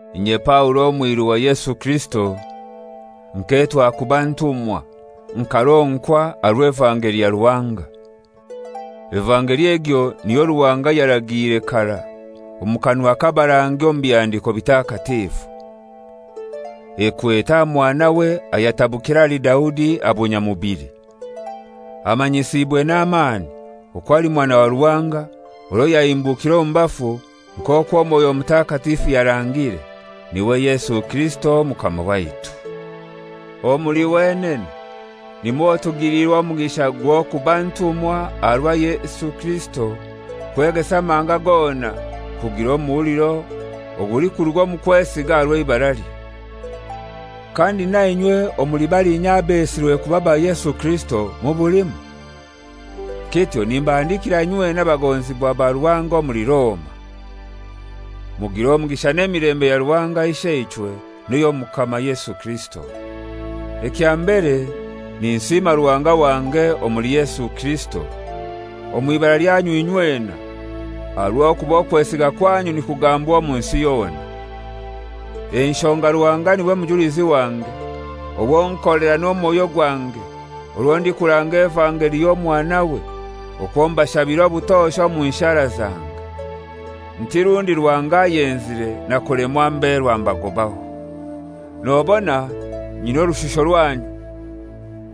Inye Paulo omwiru wa Yesu Kirisito, nketwa kuba ntumwa, nkaronkwa aha rw'evangeli ya Ruhanga. Evangeli egyo niyo Ruhanga yaragiire karai omu kanwa k'abarangi omu Bihandiko Bitakatifu. Ekwete aha Mwanawe ayatabukire ahali Daudi aha bunyamubili. Amanyisiibwe n'amaani okwo ali Mwana wa Ruhanga, orwo yahimbukire omu bafu nk'okwo Mwoyo Mutakatifu yarangire, n'iwe Yesu Kirisito Omukama waitu. Omuli wenene nimwo tugiliirwe omugisha gw'okuba ntumwa aha rwa Yesu Kirisito kwegesa amahanga gona kugira omuhuliro ogulikuruga omu kwesiga aha rw'eibaralye. Kandi na inywe omuli balinya abesirwe kuba ba Yesu Kirisito mubulimu. Kityo nimbahandikira inywena abagonzibwa ba Ruhanga omuli Roma. Mugire omugisha n'emilembe ya Ruhanga Isheichwe n'ey'Omukama Yesu Kirisito. Ekya mbere ninsiima Ruhanga wange omuli Yesu Kirisito, omw'ibara lyanyu inywena, aha rw'okuba okwesiga kwanyu nikugambwa omu nsi yona. Enshonga Ruhanga n'iwe mujulizi wange, owo nkolera n'omwoyo gwange orwo ndikuranga evangeli y'Omwanawe, okwo mbashabira obutosha omu nshara zange, nti rundi Ruhanga ayenzire nakulemwa mberwa mbagobaho. Nobona nyina orushusho rwanyu,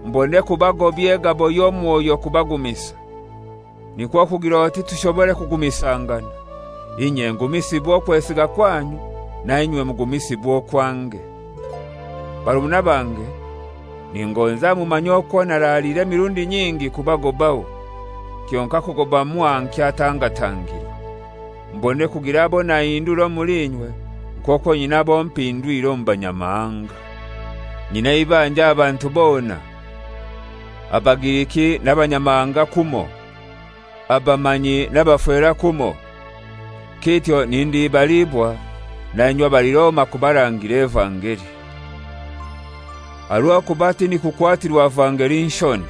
mbone kubagobya egabo y'omwoyo kubagumisa, nikwo kugir'oti tushobore kugumisangana, inye ngumisibwe okwesiga kwanyu, na inywe mugumisiibwe okwange. Barumuna bange, ningonza mumanye okwo naraaliire emirundi nyingi kubagobaho (kyonkai kugoba mwaha nkyatangatangirwe), mbone kugira abo nahindura omuli inywe, nk'okwo nyina abo mpindwire omu Banyamahanga. Nyina eibanja aha bantu bona, Abagiriki n'Abanyamahanga kumoi, abamanyi n'abafera kumoi. Kityo nindibaliibwa na inywe abali Roma kubarangira evangeli. Aha rw'okuba tindikukwatirwa vangeli nshoni: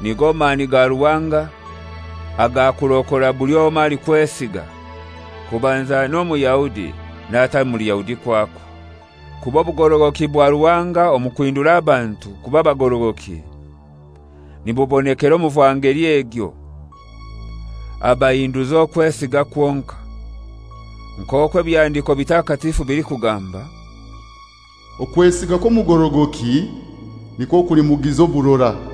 Nigo mani ga Ruhanga agakurokora buli omoi alikwesiga, kubanza n'Omuyahudi n'atali Muyahudi kwakwo. Kuba obugorogoki bwa Ruhanga omu kuhindura abantu kuba bagorogoki nibubonekera omu vangeli egyo; abahinduza okwesiga kwonkai. Nk'okwo Ebihandiko Bitakatifu bilikugamba, «Okwesiga kw'omugorogoki nikwo kulimugiza oburora.»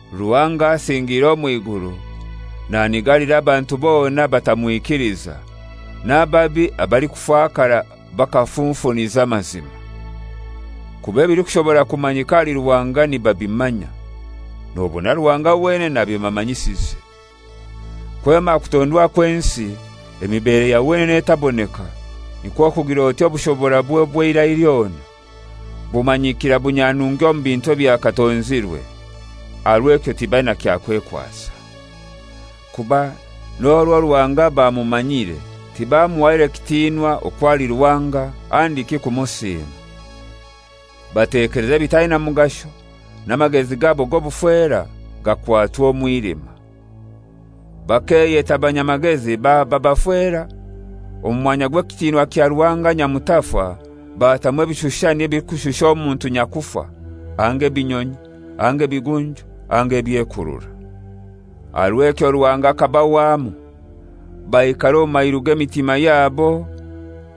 Ruhanga asingiire omw'iguru nanigalira abantu bona abatamwikiliza n'ababi abalikufakara bakafunfuniza amazima. Kuba ebilikushobora kumanyika ahali Ruhanga nibabimanya, nobona Ruhanga wenene abibamanyisize. Kwema aha kutondwa kw'ensi emibere ya wenene etaboneka, nikwo kugir'oti obushoborabwe obw'eirai lyona, bumanyikira bunyanungi omu bintu ebyakatonzirwe. Aha rw'ekyo tibaina kyakwekwasa. Kuba n'orwo Ruhanga bamumanyire tibamuhaire kitinwa okwo ali Ruhanga handiki kumusiima. Batekeleza ebitaina mugasho n'amagezi gabo g'obufera gakwatwa omwilima. Bakeyeta banyamagezi baba bafera, omu mwanya gw'ekitinwa kya Ruhanga nyamutafa batamu ebishushani ebilikushusha omuntu nyakufa anga ebinyonyi anga ebigunju anga ebyekurura. Aha rw'ekyo Ruhanga akabahwamu baikara omu mairu g'emitima yabo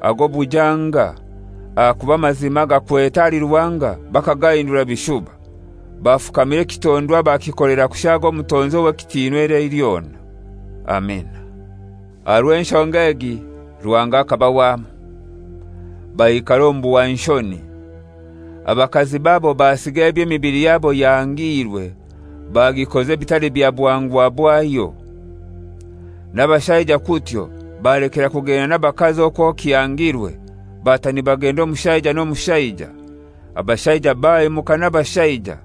ag'obujanga, ahakuba amazima agakwete ahali Ruhanga bakagahindura bishuba, bafukamira ekitondwa bakikolera kushaaga Omutonzi ow'ekitinwa eirai lyona! Amina. Aha rw'enshonga egi Ruhanga akabahwamu, baikara omu buhwanshoni. Abakazi babo basiga eby'emibili yabo yahangiirwe, bagikoza ebitali bya buhangwa bwayo. N'abashaija kutyo balekera kugenda n'abakazi okwo kihangirwe, bata nibagenda omushaija n'omushaija, abashaija bahemuka n'abashaija,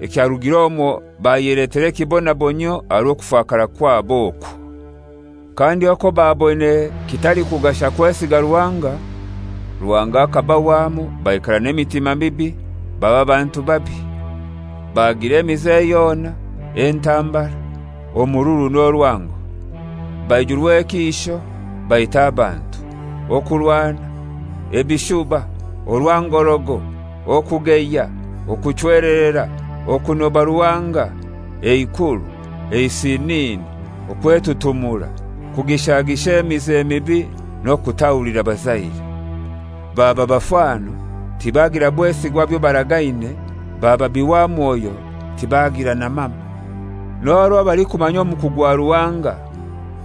ekyarugir'omwo bayeletera ekibonabonyio aha rw'okufakara kwabo okwo. Kandi okwo baboine kitalikugasha kwesiga Ruhanga, Ruhanga akabahwamu baikara n'emitima mibi, baba bantu babi. Bagira emize yona, entambara, omururu n'orwango. Baijurwa ekiisho, baita abantu, okurwana, ebishuba, orwangorogo, okugeya, okuchwelerera, okunoba Ruhanga, eikuru, eisinini, okwetutumura, kugishagisha emize mibi n'okutahulira bazaire. Baba bafano, tibagira bwesigwa aha byo baragaine, baba bihwamwoyo, tibagira na mama. N'orwo balikumanya omuku gwa Ruhanga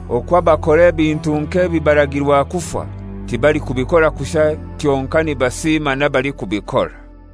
okwo abakora ebintu nk'ebi baragirwa kufa, tibalikubikora kushai kyonkai nibasiima n'abalikubikora.